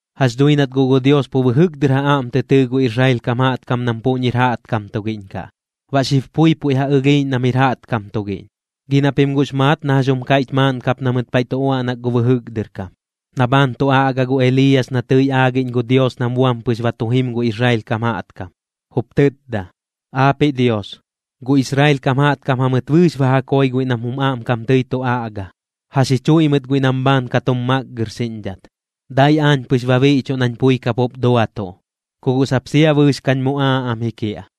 Jax dhui nat guꞌ gu Dios pu bɨjɨk dɨr ja aꞌm tɨ tɨɨ gu Israel kam jaꞌtkam nam puꞌñir jaꞌtkam tugiꞌñ kaꞌ, baꞌ xib pui puiꞌ ja ɨlhiiꞌñ nam jir jaꞌtkam tugiꞌñ. Gi na pim guꞌx maat na jax jum kaiꞌch maaꞌn kap na mɨt paiꞌ tu uaꞌnak gu bɨjɨk dɨr kam, na bhaan tu aꞌga gu Eliiyas na tɨi aagiꞌñ gu Dios nam buam pɨx ba tu jim gu Israel kam jaꞌtkam, jup tɨtda: “Aapiꞌ Dios, gu Israel kam jaꞌtkam jamɨt bɨɨx ba ja koi guiꞌ nam jum aꞌmkam tɨi tu aꞌga, ja xichuiꞌ mɨt guiꞌ nam bhaan ka tum makgɨrxiꞌñdhat. Dai aañ pɨx ba biꞌchuꞌ nañ pui kapup duatuꞌ, ku guꞌ sap sia bɨɨx kañ muꞌaaꞌ am ji kiaꞌ.”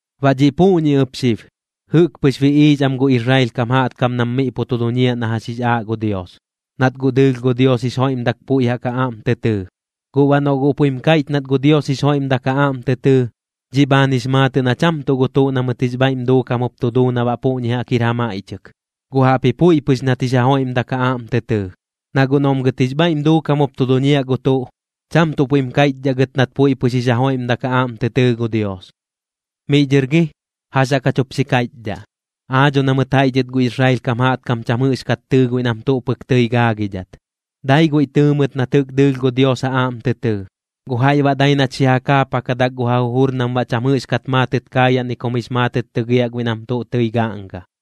Baꞌ dhiꞌ puꞌñi ɨp xib, jɨꞌk pɨx biꞌiix am gu Israel kam jaꞌtkam nam miꞌ pu tu duñiaꞌ na jax jix aaꞌ gu Dios, nat guꞌ dɨɨlh gu Dios jix joiꞌmdat puiꞌ jaꞌk ja aꞌm tɨ tɨɨ. Guꞌ baꞌ noꞌ guꞌ puiꞌm kaiꞌch nat gu Dios jix joiꞌmdak ja aꞌm tɨ tɨɨ, dhiꞌ bhaan jix maatɨꞌ na cham tuꞌ gu tuꞌ na mɨt jix bhaiꞌm duukam jup tu duu na baꞌ puꞌñi jaꞌk jir ja maiꞌchɨk, guꞌ jaꞌpji puiꞌ pɨx nat jix ja joiꞌmdak ja aꞌm tɨ tɨɨ. Na guꞌ noꞌm gɨt jix bhaiꞌm duukam jup tu duñiaꞌ gu tuꞌ, cham tuꞌ puiꞌm kaiꞌchdhaꞌ gɨt nat puiꞌ pɨx jix ja joiꞌmdak ja aꞌm tɨ tɨɨ gu Dios. ¿Miꞌ dhɨr gi, jax jaꞌk jach jup xi kaiꞌchdhaꞌ? Aa dho na mɨt jaiꞌ dhɨt gu Israel kam jaꞌtkam cham jɨꞌxkat tɨɨ guiꞌ nam tuꞌ pɨk tɨi gaagidhat, dai guiꞌ tɨɨ mɨt nat jɨꞌk dɨɨlh gu Dios ja aꞌm tɨ tɨɨ. Gu jaiꞌ baꞌ dai nat xi ja kaapakadak gu ja jujur nam baꞌ cham jɨꞌxkat maatɨt kaayaꞌ ni kum jix maatɨt tɨgiaꞌ guiꞌ nam tuꞌ tɨi gaꞌnga.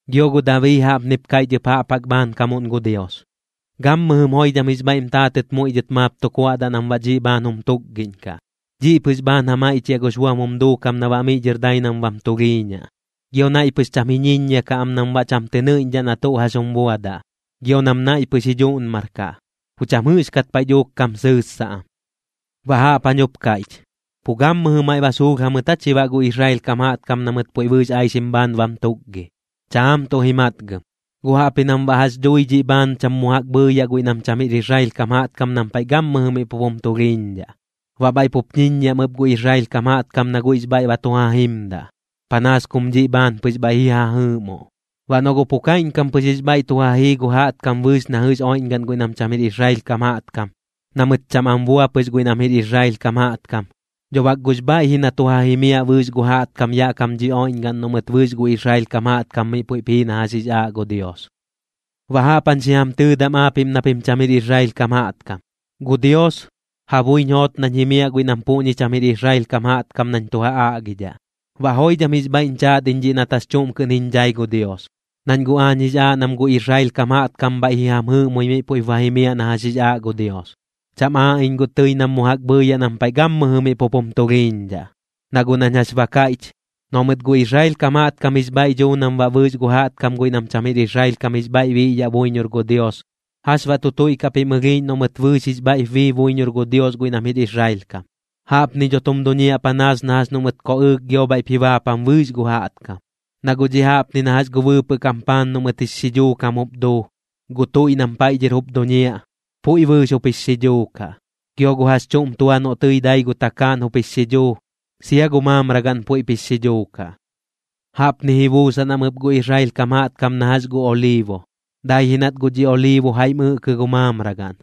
Gio gu Dabii jaꞌpnip kaiꞌch ɨp jaꞌp jaꞌk bhaankamuꞌn gu Dios: Gammɨjɨm joidham jix bhaiꞌm taatɨt muiꞌ dhɨt maap tu kuaꞌdaꞌ nam baꞌ dhiꞌ bhaan jum tukgiꞌñkaꞌ. Dhiꞌ pɨx bhaan ja maiꞌchiaꞌ gux buam jum duukam na baꞌ miꞌ dhɨr dai nam bam tulhiiñaꞌ. Gio naiꞌ pɨx cham ji ñiññia kaꞌ am nam baꞌ cham tɨ nɨiꞌñdhaꞌ na tuꞌ jax jum buadaꞌ, gio nam naiꞌ pɨx ji dhuꞌnmarkaꞌ, pu cham jɨꞌxkat paiꞌ dhuuk kam sɨɨssaꞌ am. Baꞌ jaꞌp jañ jup kaiꞌch: ¿Pu gammɨjɨ maiꞌ ba suulh jamɨt aa chi baꞌ gu Israel kam jaꞌtkam na mɨt puiꞌ bɨɨx aixim bhaan bam tukgi? Chaam tuꞌ ji matgɨm, guꞌ jaꞌpji nam baꞌ jax dhui dhiꞌ bhaan cham mu jaꞌk bhɨɨyaꞌ guiꞌ nam cham jir Israel kam jaꞌtkam nam paiꞌ gammɨjɨ miꞌ pup jum tulhiiñdhaꞌ. Baꞌ bhaiꞌ pup ñiññiaꞌm ɨp gu Israel kam jaꞌtkam na guiꞌx bhaiꞌ ba tu ja jimdaꞌ, panaas kum dhiꞌ bhaan pɨx bhaiꞌ ji ja jɨɨꞌmoꞌ. Baꞌ noꞌ guꞌ pu kaiꞌñkam pɨx jix bhaiꞌ tu ja jii gu jaꞌtkam bɨɨx na jɨꞌx oiꞌñgaꞌn guiꞌ nam cham jir Israel kam jaꞌtkam, na mɨt cham am bua pɨx guiꞌ nam jir Israel kam jaꞌtkam, dho bak guꞌx bhaiꞌ ji na tu ja jimiaꞌ bɨɨx gu jaꞌtkam yaꞌ kam dhi oiꞌñgaꞌn noꞌ mɨt bɨɨx gu Israel kam jaꞌtkam miꞌ puiꞌp jii na jax jix aaꞌ gu Dios. Baꞌ jaꞌp jañ xi jam tɨɨdam aapiꞌm na pim cham jir Israel kam jaꞌtkam: Gu Dios, ja buiñ joot nañ jimiaꞌ guiꞌ nam puꞌñi cham jir Israel kam jaꞌtkam nañ tu ja aꞌgidhaꞌ, baꞌ joidham jix bhaiꞌñ chaat iñ dhiꞌ nat jax chuꞌm kɨꞌn jiñ dhai gu Dios. Nañ guꞌ aañ jix aaꞌ nam gu Israel kam jaꞌtkam bhaiꞌ ji jam jɨɨꞌmoi miꞌ puiꞌp ba jimiaꞌ na jax jix aaꞌ gu Dios. Cham aaꞌ iñ guꞌ tɨi nam mu jaꞌk bhɨɨyaꞌ nam paiꞌ gammɨjɨ miꞌ pup jum tulhiiñdhaꞌ. Na guꞌ nañ jax ba kaiꞌch, noꞌ mɨt gu Israel kam jaꞌtkam jix bhaiꞌ duu nam baꞌ bɨɨx gu jaꞌtkam guiꞌ nam cham jir Israel kam jix bhaiꞌ ji biꞌyaꞌ buiñor gu Dios, ¿jax baꞌ tu tuiꞌkaꞌ pim ɨlhiiꞌñ noꞌ mɨt bɨɨx jix bhaiꞌp bii buiñor gu Dios guiꞌ nam jir Israel kam? Jaꞌpni dho tum duñiaꞌ panaas na jax noꞌ mɨt koꞌɨɨk gio bhaiꞌp ji baapam bɨɨx gu jaꞌtkam. Na guꞌ dhiꞌ jaꞌpni na jax gu bɨɨpɨꞌ kam paan noꞌ mɨt jix xidhuu kam jup duu, gu tuiꞌ nam paiꞌ dhɨr jup duñiaꞌ, puiꞌ bɨɨx jup jix xidhuu kaꞌ. Gio gu jax chuꞌm tua noꞌ tɨi dai gu takaaꞌn jup jix xidhuu, sia gu mamragaꞌn puiꞌp jix xidhuu kaꞌ. Jaꞌpni ji buusan am ɨp gu Israel kam jaꞌtkam na jax gu oliibo. Dai ji nat guꞌ dhi oliibo jaiꞌm ɨꞌkɨ gu mamragaꞌn,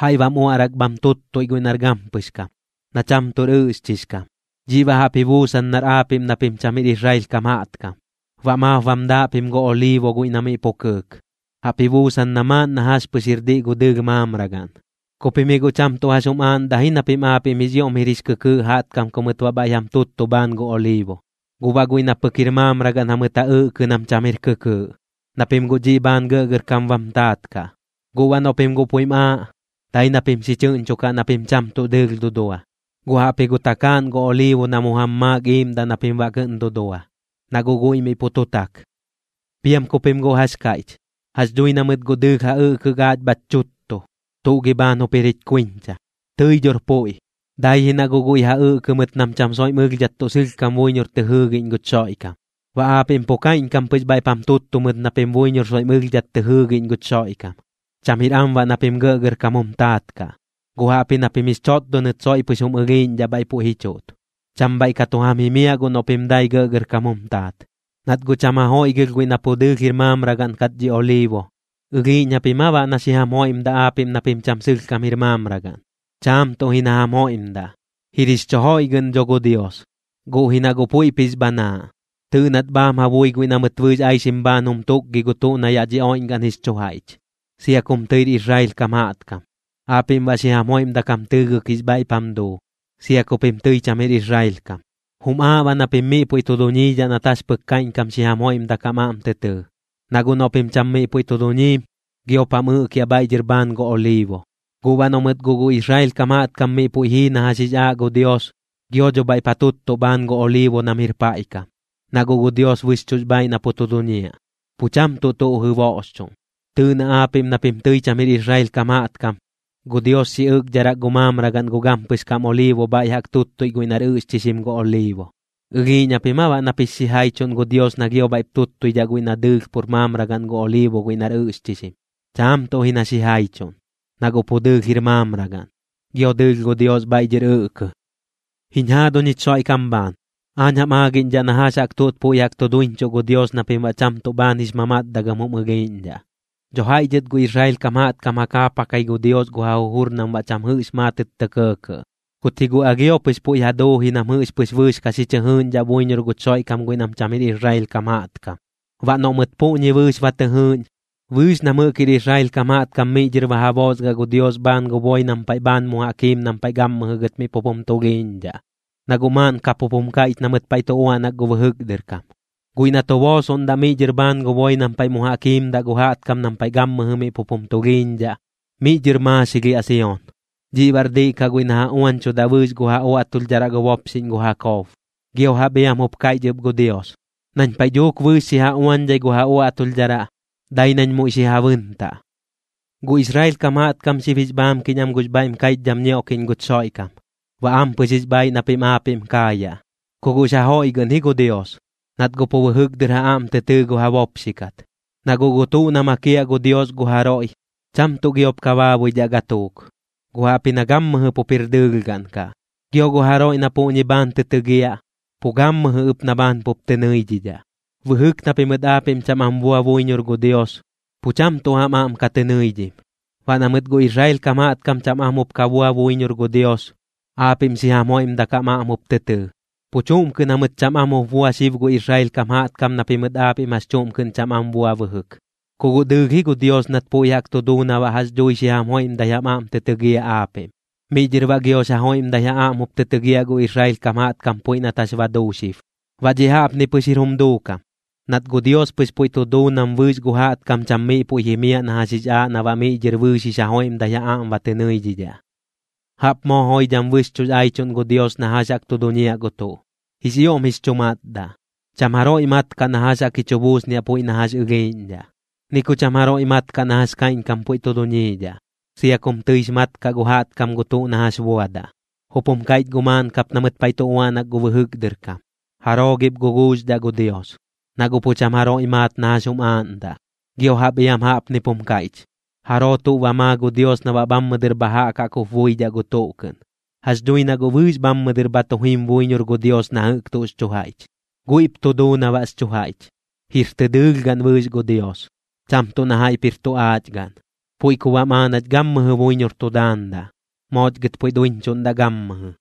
jaiꞌ baꞌm uaꞌrak bham tuttuiꞌ guiꞌ nar gampɨx kam, na cham tuꞌr ɨꞌxchix kam. Dhiꞌ baꞌ jaꞌp ji buusan nar aapiꞌm na pim cham jir Israel kam jaꞌtkam, baꞌ maap bam daaꞌ pim gu oliibo guiꞌ na miꞌ pu kɨɨk, jaꞌp ji buusan na maaꞌn na jax pɨx jir diꞌ gu dɨɨlh mamragaꞌn. Ku pim ji guꞌ cham tuꞌ jax jum aaꞌndaꞌ ji na pim aapiꞌm jix ioꞌm jir jix kɨkɨɨꞌ jaꞌtkam ku mɨt baꞌ bhaiꞌ jam tuttu bhaan gu oliibo, guꞌ baꞌ guiꞌ na pɨk jir mamragaꞌn jamɨt ja ɨꞌkɨ nam cham jir kɨkɨɨꞌ, na pim guꞌ dhiꞌ bhaan gɇꞌgɇrkam bam taat kaꞌ. Guꞌ baꞌ noꞌ pim guꞌ puiꞌm aaꞌ, dai na pim xi chɨꞌñchokaꞌ na pim cham tuꞌ dɨɨlh dudua, guꞌ jaꞌpji gu takaaꞌn gu oliibo na mu jam maak iiꞌmdaꞌ na pim baꞌ kɨꞌn dudua, na guꞌ guiꞌ miꞌ pu tu tak. Piam ku pim guꞌ jax kaiꞌch: “Jax dhui na mɨt guꞌ dɨɨlh ja ɨꞌkɨk aach bhach chuttu. ¿Tuꞌ gi bhaan jup jir jich kuiñcha?” Tɨi dhor puiꞌ, dai ji na guꞌ guiꞌ ja ɨꞌkɨ mɨt nam cham soiꞌm ɨlhdhat tuꞌ sɨlhkam buiñor tɨ jɨɨgiꞌñ guch Xoiꞌkam. Baꞌ aapiꞌm pu kaiꞌñkam pɨx bhaiꞌp jam tuttu mɨt na pim buiñor soiꞌm ɨlhdhat tɨ jɨɨgiꞌñ guch Xoiꞌkam. Cham jir am baꞌ na pim gɇꞌgɇrkam jum taat kaꞌ, guꞌ jaꞌpji na pim jix chotdonɨt soiꞌ pɨx jum ɨlhiiꞌñdhaꞌ bhaiꞌ puiꞌ ji chuꞌt. Cham bhaiꞌ ka tu jam jimiaꞌ guꞌ noꞌ pim dai gɇꞌgɇrkam jum taat, nat guꞌ cham ja joiꞌgɨlh guiꞌ na pu dɨɨlh jir mamragaꞌn kat dhi oliibo. ¿Ɨlhiiꞌñ japim aa baꞌ nap xi jam joiꞌmdaꞌ aapiꞌm na pim cham sɨlhkam jir mamragaꞌn? Chaam tuꞌ ji na jam joiꞌmdaꞌ. Jir jix chu joiꞌgɨꞌn dho gu Dios, guꞌ ji na guꞌ puiꞌp jix bhanaaꞌ. Tɨɨꞌ nat bhaam ja bui guiꞌ na mɨt bɨɨx aixim bhaan jum tukgi gu tuꞌ na yaꞌ dhi oiꞌñgaꞌn jix chu jaiꞌch, sia kum tɨir Israel kam jaꞌtkam. Aapiꞌm baꞌ xi jam joiꞌmdak jam tɨɨgɨk jix bhaiꞌp jam duu, sia ku pim tɨi cham jir Israel kam. Jum aaꞌ baꞌ na pim miꞌ puiꞌ tu duñiidhaꞌ nat jax pɨk kaiꞌñkam xi jam joiꞌmdak jam aꞌm tɨ tɨɨ, na guꞌ noꞌ pim cham miꞌ puiꞌ tu duñiim, giop jam ɨꞌkiaꞌ bhaiꞌ dhɨr bhaan gu oliibo. Guꞌ baꞌ noꞌ mɨt guꞌ gu Israel kam jaꞌtkam miꞌ puiꞌ jii na jax jix aaꞌ gu Dios, gio dho bhaiꞌp ja tuttuꞌ bhaan gu oliibo nam jir paiꞌ kam, na guꞌ gu Dios bɨxchuꞌx bhaaiꞌ na pu tu duñiaꞌ, pu cham tuꞌ tuꞌ jɨboꞌxchuꞌn. Tɨɨꞌ na aapiꞌm na pim tɨi cham jir Israel kam jaꞌtkam, gu Dios xi ɨꞌkdharak gu mamragaꞌn gu gampɨx kam oliibo bhaiꞌ jaꞌk tuttui guiꞌ nar ɨꞌxchixim gu oliibo. ¿Ɨlhiiꞌñ japim aa baꞌ nap jix xijaichuꞌn gu Dios na gio bhaiꞌp tuttuidhaꞌ guiꞌ na dɨɨlh pur mamragaꞌn gu oliibo guiꞌ nar ɨꞌxchixim? Chaam tuꞌ ji na xijaichuꞌn, na guꞌ pu dɨɨlh jir mamragaꞌn, gio dɨɨlh gu Dios bhaiꞌ dhɨr ɨꞌkɨ. Jiñ jaaduñ jich Xoiꞌkam bhaan, aañ jam aagiꞌñdhaꞌ na jax jaꞌk tuꞌt puiꞌ jaꞌk tu duiñchuꞌ gu Dios na pim baꞌ cham tuꞌ bhaan jix mamatdagɨm jum ɨlhiiꞌñdhaꞌ. Dho jaiꞌ dhɨt gu Israel kam jaꞌtkam ja kaapakai gu Dios gu ja jujur nam baꞌ cham jɨꞌx maatɨt tɇ kɇɇkɇꞌ, kut ji guꞌ alhio pɨx puiꞌ ja duu ji nam jɨꞌx pɨx bɨɨx ka xi chɨ jɨɨꞌñdhaꞌ buiñor guch Xoiꞌkam guiꞌ nam cham jir Israel kam jaꞌtkam. Baꞌ noꞌ mɨt puꞌñi bɨɨx ba tɨ jɨɨꞌñ, bɨɨx nam jɨꞌk jir Israel kam jaꞌtkam miꞌ dhɨr ba ja boosgaꞌ gu Dios bhaan gu boi nam paiꞌ bhaan mu jaꞌk jiim nam paiꞌ gammɨjɨ gɨt miꞌ pup jum tulhiiñdhaꞌ. Na guꞌ maaꞌn kap jup jum kaiꞌch na mɨt paiꞌ tu uaꞌnak gu bɨjɨk dɨr kam: Guiꞌ na tu boosoꞌndaꞌ miꞌ dhɨr bhaan gu boi nam paiꞌ mu jaꞌk jiimdaꞌ gu jaꞌtkam nam paiꞌ gammɨjɨ miꞌ pup jum tulhiiñdhaꞌ, miꞌ dhɨr maaxilhiaꞌ Sion. Dhiꞌ baꞌr diꞌ kaꞌ guiꞌ na ja uañchudaꞌ bɨɨx gu ja uaꞌtulhdharaꞌ gu bopxiꞌñ gu Jakob. Gio jaꞌp iam jup kaiꞌch ɨp gu Dios: Nañ paiꞌ dhuuk bɨɨx xi ja uañdhai gu ja uaꞌtulhdharaꞌ, dai nañ muiꞌ xi ja bɨntaꞌ. Gu Israel kam jaꞌtkam xib jix bhaamkiꞌñ am gux bhaiꞌm kaiꞌchdham ñioꞌkiꞌñ guch Xoiꞌkam, baꞌ ampɨx jix bhaiꞌ na pim aapiꞌm kaayaꞌ, ku guꞌx ja joiꞌgɨꞌn ji gu Dios, nat guꞌ pu bɨjɨk dɨr ja aꞌm tɨ tɨɨ gu ja bopxi kat. Na guꞌ gu tuꞌ na makiaꞌ gu Dios gu jaroiꞌ, cham tuꞌ giop baabuidhaꞌ gatuuk, guꞌ jaꞌpji na gammɨjɨ pup jir dɨɨlhgaꞌn kaꞌ. Gio gu jaroiꞌ na puꞌñi bhaan tɨ tɨgiaꞌ, pu gammɨjɨ ɨp na bhaan pup tɨ nɨidhidhaꞌ. Bɨjɨk na pimɨt aapiꞌm cham am bua buiñor gu Dios, pu cham tuꞌ jam aꞌm ka tɨ nɨidhim. Baꞌ na mɨt gu Israel kam jaꞌtkam cham am jup ka bua buiñor gu Dios, aapiꞌm xi jam joiꞌmdak jam aꞌm jup tɨ tɨɨ. Pu chuꞌm kɨꞌn jamɨt cham am jup bua xib gu Israel kam jaꞌtkam na pimɨt aapiꞌm jax chuꞌm kɨꞌn cham am bua bɨjɨk, ku guꞌ dɨɨlh ji gu Dios nat puiꞌ jaꞌk tu duu na baꞌ jax dhui xi jam joiꞌmdai jam aꞌm tɨ tɨgiaꞌ aapiꞌm. Miꞌ dhɨr baꞌ giox ja joiꞌmdai ja aꞌm jup tɨ tɨgiaꞌ gu Israel kam jaꞌtkam puiꞌ nat jax ba duu xib. Baꞌ dhiꞌ jaꞌpni pɨk jir jum duukam, nat gu Dios pɨx puiꞌ tu duu nam bɨɨx gu jaꞌtkam cham miꞌ puiꞌ jimiaꞌ na jax jix aaꞌ na baꞌ miꞌ dhɨr bɨɨx jix ja joiꞌmdai ja aꞌm ba tɨ nɨidhidhaꞌ. ¡Jaꞌp moo joidham bɨxchuꞌx aichuꞌn gu Dios na jax jaꞌk tu duñiaꞌ gu tuꞌ! Jix ioꞌm jix chu matdaꞌ. Cham jaroiꞌ mat kaꞌ na jax jaꞌk ji chu buusniaꞌ puiꞌ na jax ɨlhiiꞌñdhaꞌ, ni ku cham jaroiꞌ mat kaꞌ na jax kaiꞌñkam puiꞌ tu duñiidhaꞌ, sia kum tɨix mat kaꞌ gu jaꞌtkam gu tuꞌ na jax buadaꞌ. Jup jum kaiꞌch guꞌ maaꞌn kap na mɨt paiꞌ tu uaꞌnak gu bɨjɨk dɨr kam: “¿Jaroo gip guguuxdhaꞌ gu Dios? Na guꞌ pu cham jaroiꞌ maat na jax jum aaꞌndaꞌ.” Gio jaꞌp iam jaꞌpnip jum kaiꞌch: “¿Jaroo tuꞌ ba maa gu Dios na baꞌ bhammɨ dɨr bha jaꞌk jaꞌk jup buidhaꞌ gu tuꞌ kɨꞌn?” Jax dhui na guꞌ bɨɨx bhammɨ dɨr bha tu jim buiñor gu Dios na jɨꞌk tuꞌx chu jaiꞌch, guiꞌp tu duu na baꞌx chu jaiꞌch. Jir tɨ dɨɨlhgaꞌn bɨɨx gu Dios, cham tuꞌ na jaiꞌp jir tu aachgaꞌn. Puiꞌ ku baꞌm aaꞌ nach gammɨjɨ buiñor tu daandaꞌ. Mooch gɨt puiꞌ duiñchuꞌndaꞌ gammɨjɨ.